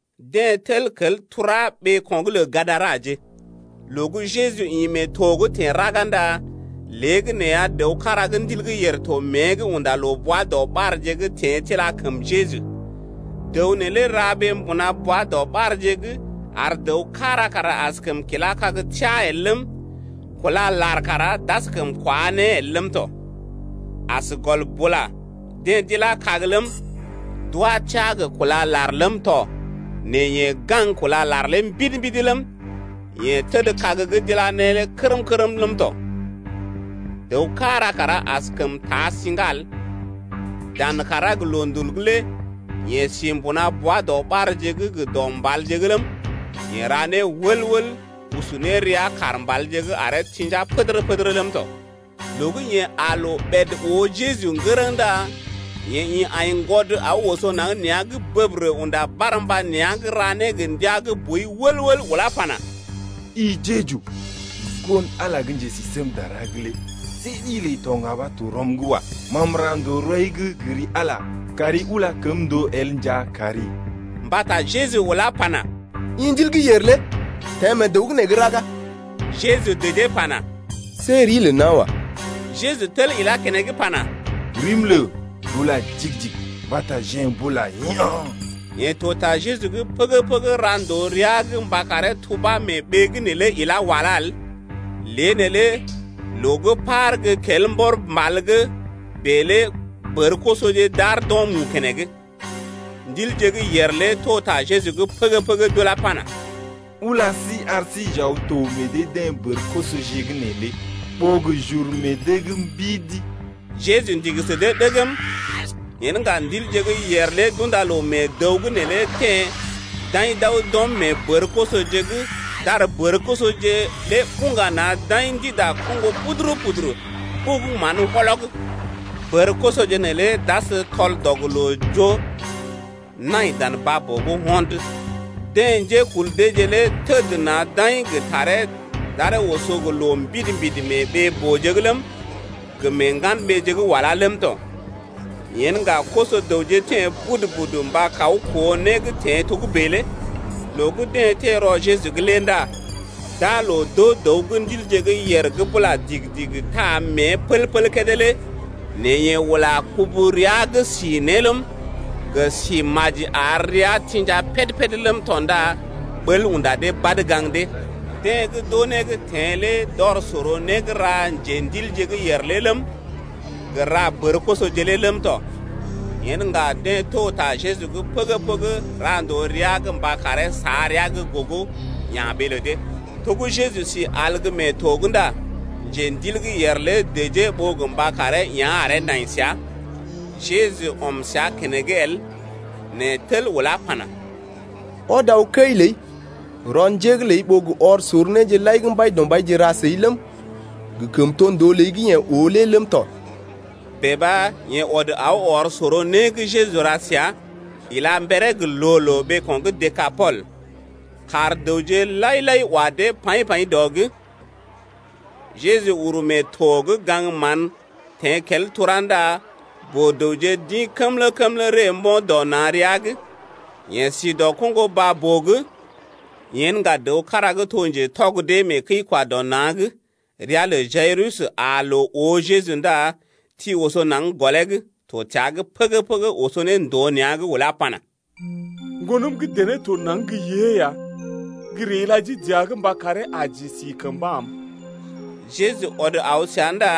Deḛ teḛ kel tura ɓeeko̰’g lə Gadaraje. Loo gə́ Jeju ḭ mee to’g teḛ raga ndá léegəneeya dəw kára gə́ ndil gə́ yèr to mée’g unda loo bwa-doɓarje’g teḛ tila kəm Jeju. Dəw neelé ra ɓee mbuna bwa-doɓarje’g ar dəw kára kara askəm kilá kag teá el ləm, kúla lar kara d’askəm kwá ne el ləm tɔ. As gɔl bula deḛ d’ilá kag ləm, d’wá teá gə kúla lar ləm tɔ nɛ yeḛ gaŋg kúla lar lé mbidi-mbidi ləm, yeḛ təd kag gə́ d’ila ne lé kərm-kərm ləm tɔ. Dəw kára kara askəm taa siŋga el. Dan kàrá gə loondul lé yeḛ si mbuna bwa-doɓarje’g gə dɔ mbalje’g ləm, yeḛ ra né wəl-wəl usu ne rəa kaar mbalje’g aree tḭja pədərə-pədərə ləm tɔ. Loo gə́ yeḛ aa loo ɓèd oo Jeju ŋgərəŋ ndá yeḛ ḭ aiŋgwɔd aw oso naŋg nea̰’g bəbərə unda barmba nea̰’g ra né gə ndia gə́ boi wəl-wəl ulá pana: I Jeju, Ŋgon-Ala lé gə́ Njesisémdara’g lé see ɗi ləi to ŋga ɓa to rɔm’g wa. Ma m’ra ndòo rɔi’g gə ri Ala mba kari ula kəm ndòo el nja kari. Mbata Jeju ulá pana: I ndil gə́ yèr lé teḛ mee dəw’g nee gə́ raga. Jeju dəjee pana: See rii lə nawa. Yeḛ tel ilá keneŋ pana: Rim lə Bula digi-digi. Mbata jeḛ m’bula yaa̰. Yeḛ to ta Jeju’g pəgə-pəgə ra ndòo rəa’g mba karee tubá mee ɓee’g neelé ilá walá el. Lée neelé loo gə́ par gə́ kel mbɔr mbal’g bèe lé bər-kosoje d’aar d’o̰ mu keneŋ. Ndilje gə́ yèr lé to ta Jeju’g pəgə-pəgə d’ulá pana: Ula sí ar sí j’aw n’to meḛ dee-deḛ bər-kosoje’g neelé ɓó gə j’uru meḛ dee’g mbidi. Jeju ndigi sə dee ɗəgm. Yen ŋga ndilje gə́ yèr lé d’unda loo mee dəw’g neelé teḛ d’aḭ d’aw d’ɔm mee bər-kosoje’g d’ar bər-kosoje lé buŋga na̰ d’aḭ ndida koŋgo puduru-puduru ɓugu mán wɔlɔg, bər-kosoje neelé d’as tɔl-dɔg-loo-joo nai dan baa-boo’g ho̰d. Deḛ njékul deeje lé təd na̰ d’aḭ gə taree d’aree oso gə loo mbidi-mbidi mee ɓee-booje’g ləm, gə mee ŋgan-ɓeeje gə́ walá ləm tɔ. Yen ŋga koso-dəwje teḛ budu-budu mba kaw koo né gə́ teḛ togə́bè lé. Loo gə́ deḛ teḛ rɔ Jeju’g lé ndá d’aa loo d’oo dəw gə́ ndilje gə́ yèr gə́ bula digi-digi taa mée pəl-pəl kédé lé nɛ yeḛ ula kubu rəa’g si ne ləm, gə si maji ar rəa tḭja péd-péd ləm tɔ ndá ɓəl unda dee badə gaŋg dee. Deḛ gə́ d’oo né gə́ teḛ lé d’ɔr sor né gə́ ra njendilje gə́ yèr lé ləm, gə ra bər-kosoje lé ləm tɔ. Yen ŋga deḛ to ta Jeju’g pəgə-pəgə ra ndòo rəa’g mba karee sa rəa gə́ gogo, ya̰ ɓee lə dee. To gə́ Jeju si al gə́ mee to’g ndá njendil gə́ yèr lé dəjee ɓó gə mba karee yá̰ aree nai səa. Jeju ɔm səa keneŋ el nɛ tel ulá pana: Ɔd aw kəi ləi rɔ njé’g ləi ɓó gə ɔr sor néje lai gə́ Mbaidɔmbaije ra səi ləm, gə kəmtondoo ləi gə́ yeḛ oo lé ləm tɔ. Bèe ɓa yeḛ ɔd aw ɔr sor né gə́ Jeju ra səa ila mberee gə loo-loo ɓeeko̰ gə́ Dekapol. Kaar dəwje lai-lai wa dee paḭ-paḭ dɔ’g. Jeju uru mee to’g gaŋg mán teḛ kel tura ndá boo-dəwje d’ḭ kəmlə-kəmlə ree mbo̰ dɔ na̰ rəa’g. Yeḛ si dɔ koŋgo baa-boo’g. Yen ŋga dəw kára gə́ to mbai gə́ njekəi-kwa-dɔ-na̰, gə́ ria lə Jayirus, aa loo oo Jeju ndá ti oso naŋg gɔlee’g, to təa’g pəgə-pəgə oso ne ndòo nea̰’g ulá pana: Ŋgonəm gə́ dené to naŋg gə́ yée ya. Gə́ ree ila jii dəa’g mba karee aji si kəmba am. Jeju ɔd aw səa ndá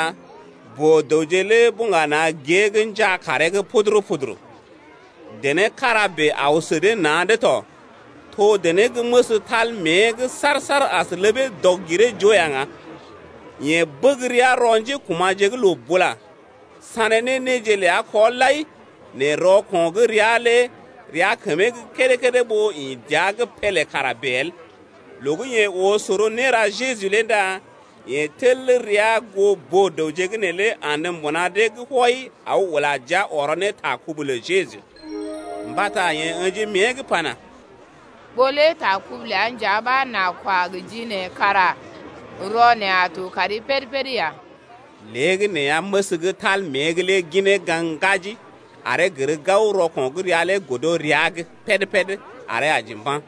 boo-dəwje lé buŋga na̰ gée’g njaa kaaree’g puduru-puduru. Dené kára bèe aw sə dee na̰’d tɔ, to dené gə́ məs tal rəa’g saar-saar as ləbee dɔg-giree-joo ya ŋga. Yeḛ bəg rəa rɔ njékuma̰je’g loo bula, sané ne néje ləa kɔ lai, nɛ rɔko̰ gə́ rəa lé rəa kəmee gə́ kédé-kédé ɓó ḭ dəa’g pélé kara bèe el. Loo gə́ yeḛ oo sor néra Jeju lé ndá yeḛ tel rəa goo boo-dəwje’g neelé andə mbuna dee’g wɔi aw ula jia ɔrɔ ne ta kubu lə Jeju. Mbata yeḛ ə̰ji mée’g pana: Ɓó lé ta kubu ləa nja ɓa n’a kwa gə ji neḛ kara rɔ neḛ a to kari péd-péd ya. Léegəneeya məs gə́ tal rəa’g lé ginee gaŋg ŋgaji aree gər gao rɔko̰ gə́ rəa lé godo rəa’g péd-péd aree aji mba̰.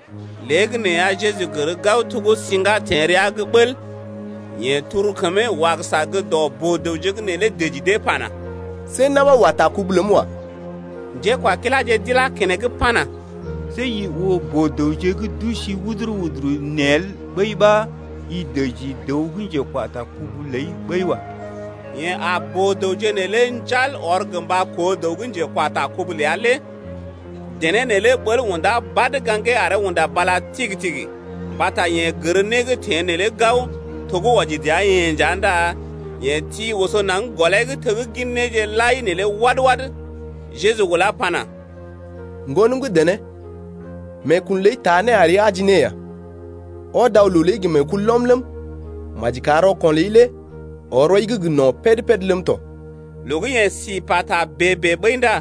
Léegəneeya Jeju gər gao to gə́ siŋgá teḛ rəa’g bəl. Yeḛ turu kəmee wagəsa gə́ dɔ boo-dəwje’g neelé dəji dee pana: See na̰ ɓa wa ta kubu ləm wa. Njékwakiláje d’ilá keneŋ pana: See i oo boo-dəwje gə́ d’usi wuduru-wuduru nee el ɓəi ɓa i dəji dəw gə́ njekwa ta kubu ləi ɓəi wa. Yeḛ aa boo-dəwje neelé njal ɔr gə mba koo dəw gə́ njekwa ta kubu ləa lé. Dené neelé ɓəl unda badə gaŋgee aree unda bala tigi-tigi mbata yeḛ gər né gə́ teḛ neelé gao, to gə́ wɔji dəa-yeḛ nja ndá yeḛ ti oso naŋg gɔlee’g teggin néje lai neelé wad-wad. Jeju ulá pana: Ŋgonəm gə́ dené, meekun ləi taa né ari aji ne ya, ɔd aw loo ləi gə meekulɔm ləm, maji kar rɔko̰ ləi lé ɔr rɔi’g gə no̰ péd-péd ləm tɔ. Loo gə́ yeḛ si pata bèe-bèe ɓəi ndá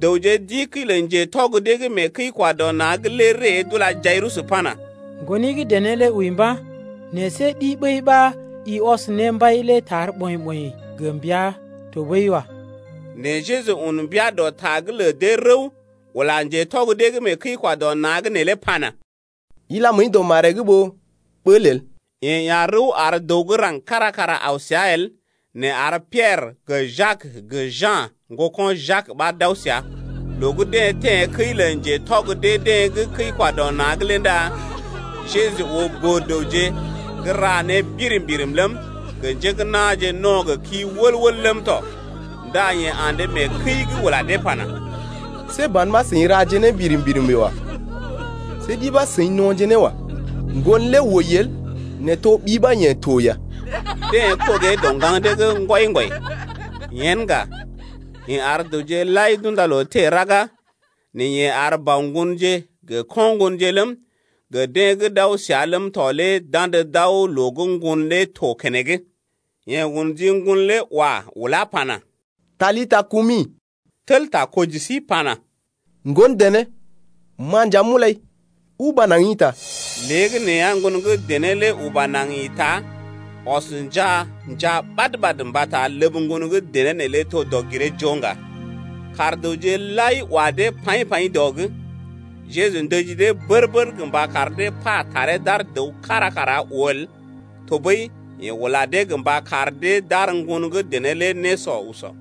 dəwje d’ḭ kəi lə ŋgatɔg gə́ mee kəi-kwa-dɔ-na̰’g lé ree d’ula Jayirus pana: Ŋgoni gə́ dené lé wəi mba̰, nɛ see ɗi ɓəi ɓa i ɔs ne mbai lé tar ɓɔḭ-ɓɔḭ gə mbəa tɔɓəi wa. Nɛ Jeju un mbia dɔ ta’g lə dee rəw, ula ŋgatɔg dee gə́ kəi-kwa-dɔ-na̰’g neelé pana: Ila məəi dɔ maree’g ɓó ɓəl el. Yeḛ ya̰ rəw ar dəw gə́ raŋg kára kara aw səa el nɛ ar Piɛrə gə Jak gə Ja̰, ŋgoko̰ Jak ɓa d’aw səa. Loo gə́ deḛ teḛ kəi lə ŋgatɔg dee-deḛ gə́ kəi-kwa-dɔ-na̰’g lé ndá Jeju oo boo-dəwje gə́ ra ne birim-birim ləm, gə njé gə́ na̰je no̰ gə kii wəl-wəl ləm tɔ. Ndá yeḛ andə mee kəi’g ula dee pana: See ban ɓa seḭ raje né birim-birim bèe wa. See ɗi ɓa seḭ no̰je ne wa. Ŋgon lé wəi el nɛ to ɓi ɓa yeḛ to ya. Deḛ kɔgee dɔ ŋgaŋ dee’g ŋgwɔi-ŋgwɔi. Yen ŋga, yeḛ ar dəwje lai d’unda loo teḛ raga nɛ yeḛ ar bɔ ŋgonje gə ko̰ ŋgonje ləm, gə deḛ gə́ d’aw səa ləm tɔ lé d’andə d’aw loo gə́ ŋgon lé to keneŋ. Yeḛ un ji ŋgon lé wa ulá pana: Talita kumi (tel takɔji sí pana: Ŋgon dené, ma nja m’ulai, uba naŋg ḭta). Léegəneeya ŋgon gə́ dené lé uba naŋg ḭta, ɔs njaa, njaa ɓad-ɓad mbata ləb ŋgon gə́ dené neelé to dɔg-giree-joo ŋga. Kaar dəwje lai wa dee paḭ-paḭ dɔ’g. Jeju ndəji dee bər-bər gə mba kar dee pa taree d’ar dəw kára kara oo el, tɔɓəi yeḛ ula dee gə mba kar dee d’ar ŋgon gə́ dené lé nésɔ usɔ.